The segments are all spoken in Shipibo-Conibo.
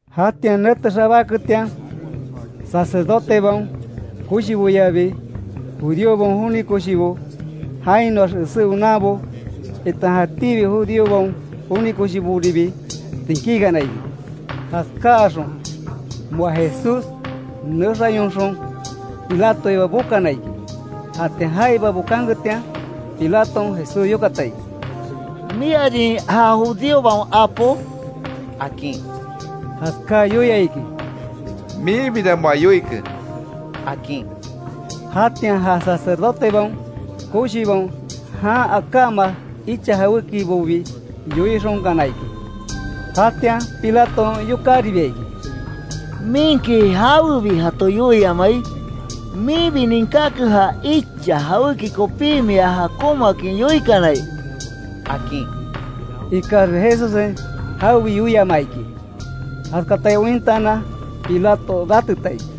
Jatian nete xabáketian, sacerdotebaon koshiboyabi, judíobaon joni koshibo, jainoax esé onanbo, itan jatíbi judíobaon joni koshiboribi tsinkíkana iki. Jaskáxon moa Jesús nexayonxon, Pilatoiba bokana iki. Jatian jaiba bokanketian, Pilaton, Jesús yokata iki: —¿Miarin ja judíobaon apo? —akin. Jaskaa yoia iki: —Minbira moa yoike —akin. Jatian ja sacerdotebaon koshibaon, jan akáma icha jawékibobi yoixonkana iki. Jatian Pilaton, yokáribia iki: —¿Minki jawebi jato yoiamai? Minbi ninkáke ja icha jawéki kopí mia jakonmaakin yoikanai —akin. Ikaxbi Jesussen jawebi yoiamaa iki. Jaskatai ointaanan, Pilato rateta iki.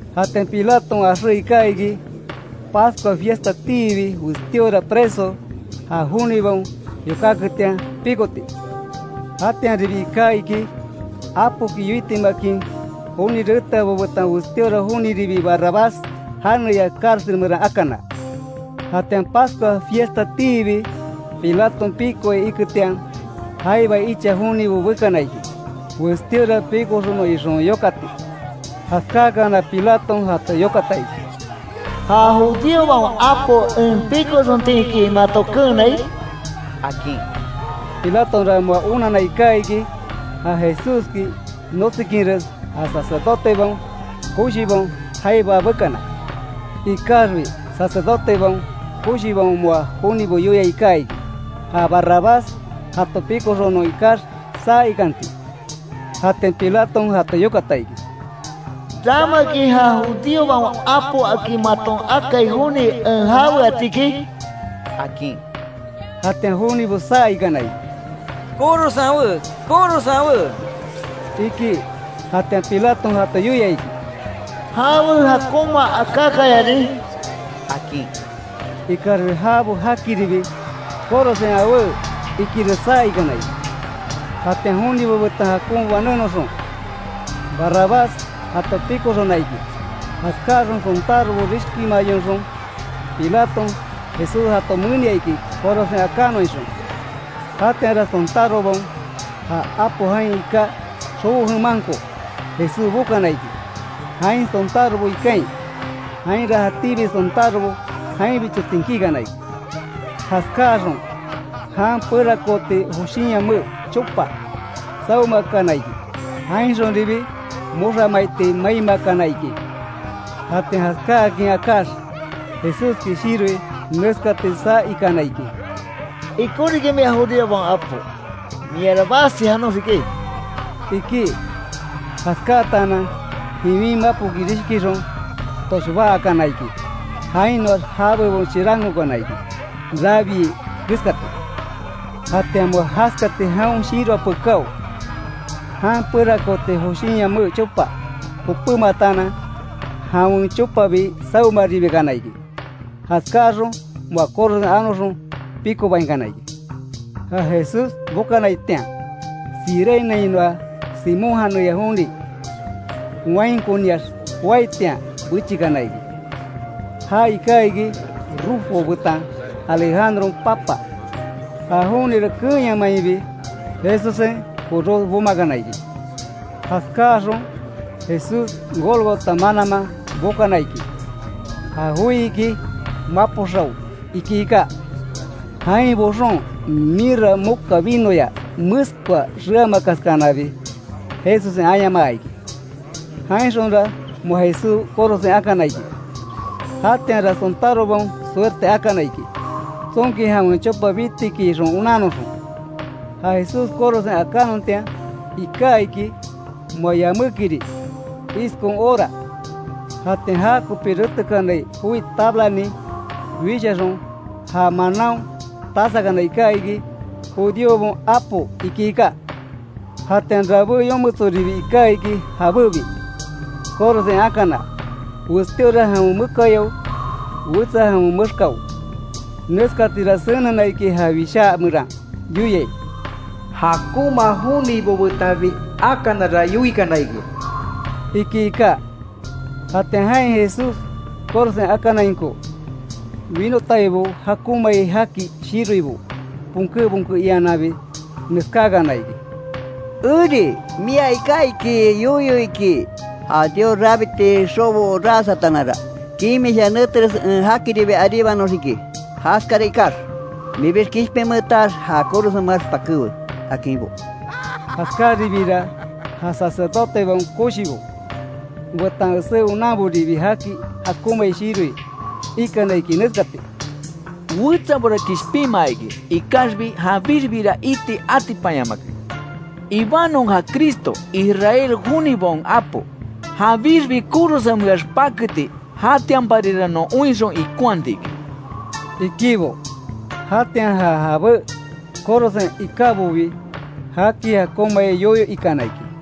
Jatian Pilaton axé iká iki, Pascua fiestatiibi westíora preso, ja jonibaon yokáketian pikoti. Jatianribi iká iki, apoki yoitimakin joni reteabo betan westíora joniribi Barrabás janeya cárcel meran akana. Jatian Pascua fiestatiibi Pilaton pikoai iketian, jaiba icha jonibo bekana iki, westíora pikoxonon ixon yokati. Jaskáakana Pilaton jato yokata iki: —¿Ja judíobaon apo en pikoxontiki mato keenai? —akin. Pilatonra moa onanna iká iki, ja Jesúski notsikinres ja sacerdotebaon koshibaon jaiba bekana. Ikaxbi sacerdotebaon koshibaon moa jonibo yoia iká iki, ja Barrabás jato pikoxonon ikax, saa ikanti. Jatian Pilaton jato yokata iki: —¿Ramaki ja judíobaon apo akin maton akai joni, en jaweatiki? —akin. Jatian jonibo saa ikana iki: —Korosen awé, korosen awé —iki. Jatian Pilaton jato yoia iki: —¿Jawe jakonma akákayarin? —akin. Ikaxbi jabo jakiribi, ¡korosen awé! Ikires saa ikana iki. Jatian jonibo betan jakon banénoxon, Barrabás jato pikoxona iki. Jaskáaxon sontárobo rishkimayonxon, Pilaton, Jesús jato menia iki; korosen akanon ixon. Jatianra sontárobaon, ja apo jain iká xobo jemanko Jesús bokana iki, jain sontárobo ikain. Jainra jatíbi sontárobo jainbicho tsinkíkana iki. Jaskáaxon jan perakooti joshinyame chopa, sawemakana iki. Jainxonribi moxa maiti maimakana iki. Jatian jaskáakin akáx, Jesúski shiroi neskati saa ikana iki: —Ikon riki mia judíobaon apo, miara basi janoxiki —iki. Jaskáatanan jiwin mapoki rishkixon, toshbá akana iki. Jainoax jabebon chirankokana iki, rabiai keskati. Jatian moa jaskati jaon shiroa pekáo, jan perakooti joshinyame chopa jopémataanan jawen chopabi sawemaribikana iki. Jaskáaxon moa korosen anoxon pikobainkana iki. Ja Jesús bokanaitian, Cireneainoa Simón janeya joni wainkoniax joaitian bechikana iki. Já iká iki, Rufo betan Alejandron papa. Ja jonira keenyamainbi Jesussen koros bomakana iki. Jaskáaxon Jesús Gólgota mananman bokana iki. Ja joi iki: “Mapo xao”, iki iká. Jain boxon, mirra moka vinoya meskoa xeamakaskanabi, Jesussen ayamaa iki. Jainxonra moa Jesús korosen akana iki. Jatianra, sontárobaon suerte akana iki, tsonki jawen chopa bitiki ixon onannoxon. Ja Jesús korosen akannontian iká iki, moa yamékiri, iskon hora. Jatian jakopi retekanai joi tablanin wishaxon, já manaon tasakana iká iki: “Judíobaon apo”, iki iká. Jatian rabé yometsoribi iká iki jabébi korosen akana. Westíora jawen mekayao; wetsa jawen mexkao. [Neskatira senena iki ja Wishá meran yoiai: “Jakonma jonibo betanbi akanara yoikana iki”] iki iká. Jatian jain Jesús korosen akanainko, winotaibo jakonmai jaki shiroibo, bonké, bonke iannanbi, neskákana iki: —¡Eri! Mia iká iki yoyo iki, ja Dios rabiti xobo ras ataananra, kimisha neteres en jakiribi aríbanoxiki iki. Jaskara ikax, minbix kishpinmeetax ja korosenmeax, pakéwe —akinbo. Jaskaribiira ja sacerdotebaon koshibo, betan esé onanboribi jaki jakonmai shiroi, ikana iki neskati: —Wetsabora kishpinmaa iki, ikaxbi janbixbira iti atipanyamake. Ibanon ja Cristo, Israel jonibaon apo, janbixbi korosenmeax paketi, jatianparira non oinxon ikonhatiki —ikibo. Jatian ja jabé korosen ikábobi jaki jakonmai yoyo ikana iki.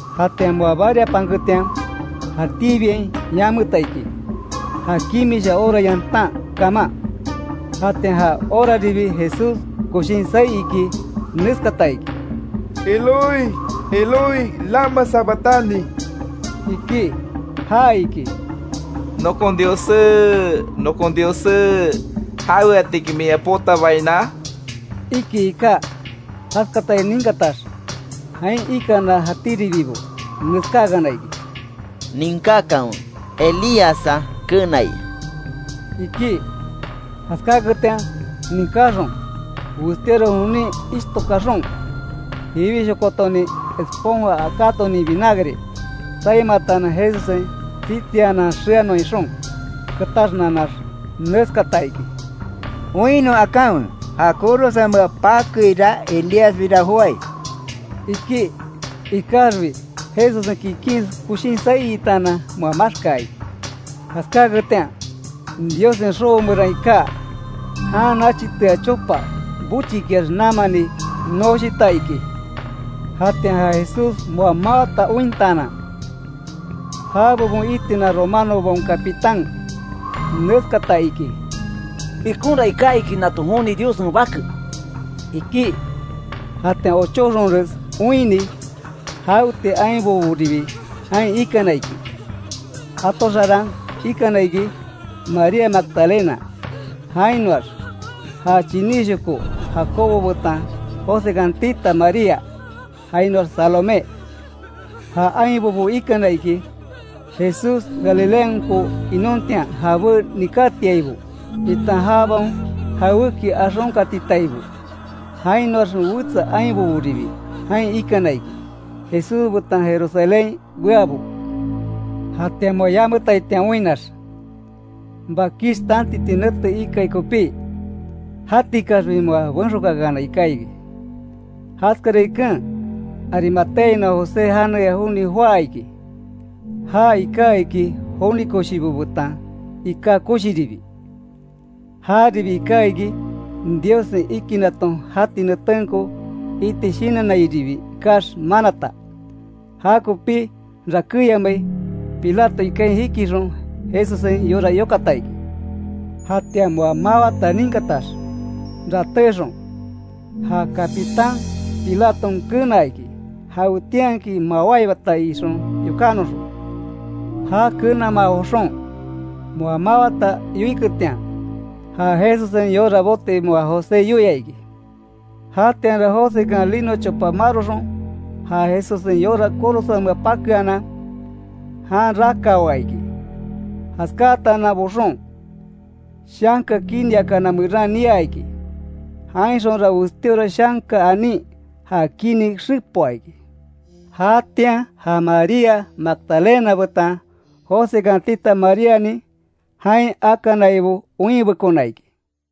Jatian moa bariapanketian, jatíbiain yameta iki, ja kimisha hora yantan kaman. Jatian ja horaribi, Jesús koshin saí iki, neskata iki: “Eloi, Eloi ¿Lama sabactani?” iki. (Ja iki: “Nokon Diossé, nokon Diossé ¿Jaweatiki min ea potabaina?”) iki iká. Jaskatai ninkatax, jain ikana jatíribibo neskákana iki: —Ninkákanwe, Elíassa kenai —iki. Jaskáketian ninkaxon, westíora jonin ishto kaxon, jiwishokotonin esponja akátonin vinagre tsaimataanan Jesussen tsitsianan xeanon ixon, ketaxnanax, neskata iki: —Oinnon akanwe; ja korosenmea pakeira Elíasbira joái —iki. Ikaxbi Jesussen kikin koshin saí itaanan, moa maxkaa iki. Jaskáketian, Diossen xobo meran iká, jan nachitea chopa, bochikiax namani noshita iki. Jatian ja Jesús moa mawata ointaanan, ja bebon itina romanobaon capitán, neskata iki: —Ikonra iká iki nato joni Diossen Bake —iki. Jatian ochóxonres oinni, jaweti ainboboribi jain ikana iki. Jato xarán ikana iki; María Magdalena, jainoax, ja chiníshoko Jacobo betan Josekan tita María, jainoax Salomé. Ja ainbobo ikana iki, Jesús Galileanko inontian jabé nikátiaibo, itan jabaon jawéki axonkatitaibo. Jainoax wetsa ainboboribi jain ikana iki, Jesús betan Jerusalénhain beabo. Jatian moa yametaitian oinnax, bakish tantiti nete ikai kopí, jatikaxbi moa benxokáakanai iká iki. Jaskara iken, Arimateainoa José janeya joni joá iki, já ika iki joni koshibo betan iká koshiribi. Jaribi iká iki, Diossen ikinaton jati netenko iti shinannairibi ikax manata. Jakopí rakéyamai, Pilato ikain jikixon Jesussen yora yokata iki. Jatian moa mawata ninkatax ratéxon, ja capitán Pilaton kenaa iki jawetianki mawáibata ixon yokánoxon. Ja kenamaa joxon, moa mawata yoiketian, ja Jesussen yora boti moa José yoia iki. Jatianra Josekan lino chopa maroxon ja Jesussen yora korosenmea pakeanan, jan rakawaa iki. Jaskáatanan boxon, shanka kiniakana meran niaa iki. Jainxonra westíora shanka anin ja kini xepoa iki. Jatian ja María Magdalena betan Josekan tita Maríanin, jain akanaibo oinbekona iki.